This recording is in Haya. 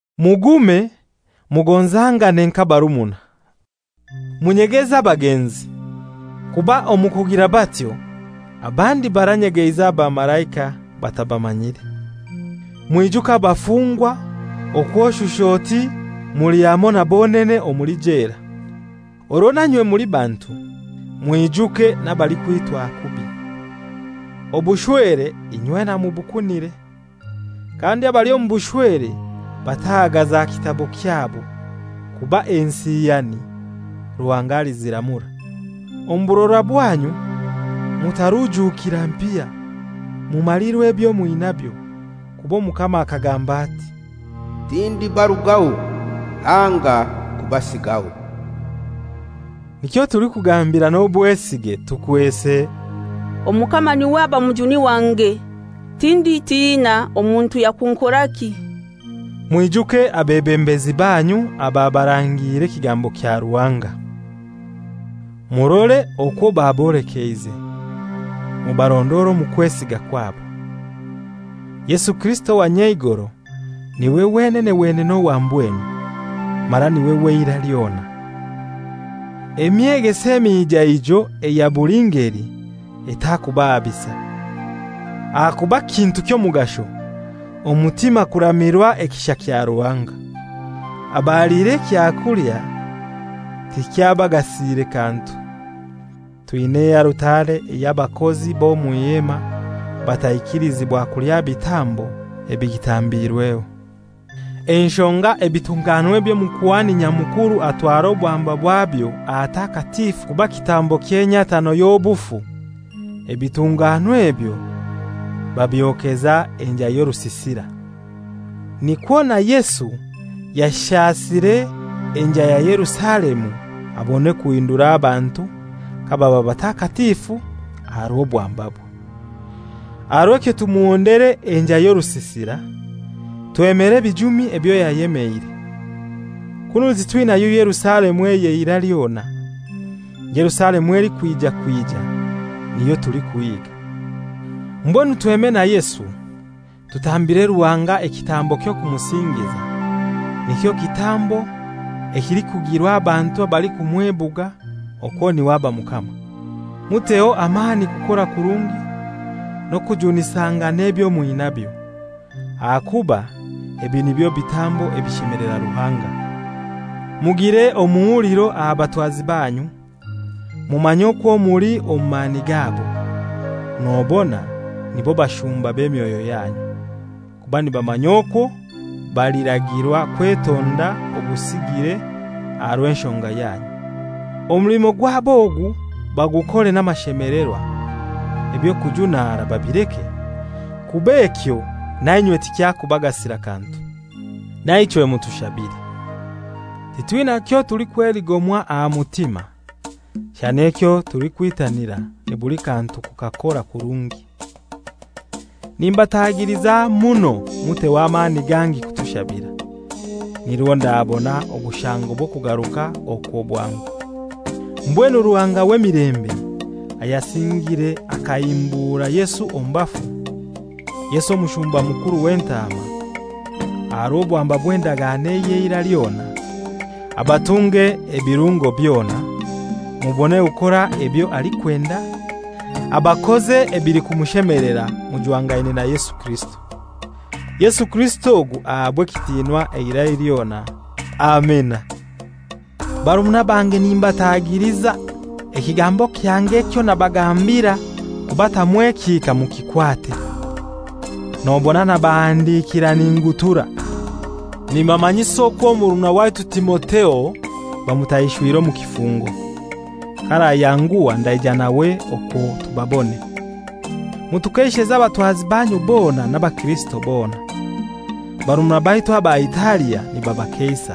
Mugume mugonzangane mka abarumuna. Munyegeze abagenzi, kuba omu kugira batyo abandi baranyegeize abamalaika batabamanyire. Mwijuke abafungwa okw'oshusha oti muli hamoi na bonene omuli jela. Orwo nainywe muli bantu mwijuke n'abalikwitwa kubi. Obushwere inywena mubukunire, kandi abali omu bushwere batahagaza kitabo kyabo, kuba ensiyani Ruhanga aliziramura. Omu burora bwanyu mutarujuukira mpiya, mumalirwe ebyo mwinabyo; kuba Omukama akagamba ati, «Tindibarugaho anga kubasigaho.» Nikyo tulikugambira n'obwesige tukwese, «Omukama n'iwe aba mujuni wange, tinditina; omuntu yakunkoraki?» Mwijuke abebembezi baanyu ababarangiire ekigambo kya Ruhanga. Murore okwo babolekeize, mubarondore omu kwesiga kwabo. Yesu Kirisito owa nyeigoro n'iwe wenene wenene owa mbwenu, mara n'iwe w'eirai lyona. Emyegeso emijaiijo eya buli ngeli etakuubahabisa. Ahakuba kintu ky'omugasho omutima kuramirwa ekisha kya Ruhanga. Abaliire ekyakulya tikyabagasire kantu. Twina ealutare ey'abakozi b'omw'Ihema bataikilizibwa kulya bitambo ebigitambiirweho. Enshonga ebitunganwa eby'Omukuhani Nyamukuru atwara obwamba bwabyo ahatakatifu kuba kitambo ky'enyatano y'obufu, ebitunganwa ebyo babyokeza enjai y'orusisira. Nikwo na Yesu yashasire enjai ya Yerusalemu abone kuhindura abantu kababa batakatifu aha rw'obwambabwe. Aha rw'ekyo tumuhondere enjai y'orusisira, twemere ebijumi ebyo yayemeire. Kunu titwinayo Yerusalemu ey'eirai lyona. Yerusalemu elikwija kwija niyo tulikuhiiga. Mbwenu tweme na Yesu tutambire Ruhanga ekitambo ky'okumusingiza, nikyo kitambo ekilikugirwa abantu abalikumwebuga okwo n'iwe aba Mukama. Muteho amani kukora kurungi n'okujunisangana ebyo mwinabyo, aha kuba ebi nibyo bitambo ebishemelera Ruhanga. Mugire omuhuliro aha batwazi banyu, mumanye okwo muli omu mani gabo; nobona nibo bashumba b'emyoyo yanyu, kuba nibamanya okwo baliragirwa kwetonda obusigire aha rw'enshonga yanyu. Omulimo gwabo ogu bagukore n'amashemelerwa; eby'okujunara babileke, kuba ekyo nainywe tikyakubagasira kantu. Naichwe mutushabire. Titwina kyotulikweligomwa aha mutima, shana ekyo tulikwitanira ni buli kantu kukakora kurungi. Nimbatagiliza muno muteho amani gangi kutushabira, nirwo ndabona obushango bw'okugaruka okwo bwangu. Mbwenu Ruhanga w'emilembe, ayasingire akahimbura Yesu omu bafu, Yesu omushumba mukuru w'entaama, aha rw'obwamba bw'endagano ey'eirai lyona, abatunge ebirungo byona, mubone kukora ebyo alikwenda, abakoze ebilikumushemelera mujwangaine na Yesu Kirisito. Yesu Kirisito ogu ahabwe ekitinwa eirai lyona. Amina. Barumuna bange nimbatagiliza, ekigambo kyange ekyo nabagambira kubatamu ekihika mukikwate, nobona nabahandikira ningutura. Nimbamanyisa okwo murumuna waitu Timotheo bamutaishwire omu kifungo. K'arayanguha ndaija nawe okwo tubabone. Mutukeisheze abatwazi banyu bona n'abakirisito bona. Barumuna baitu aba Italia nibabakeisa.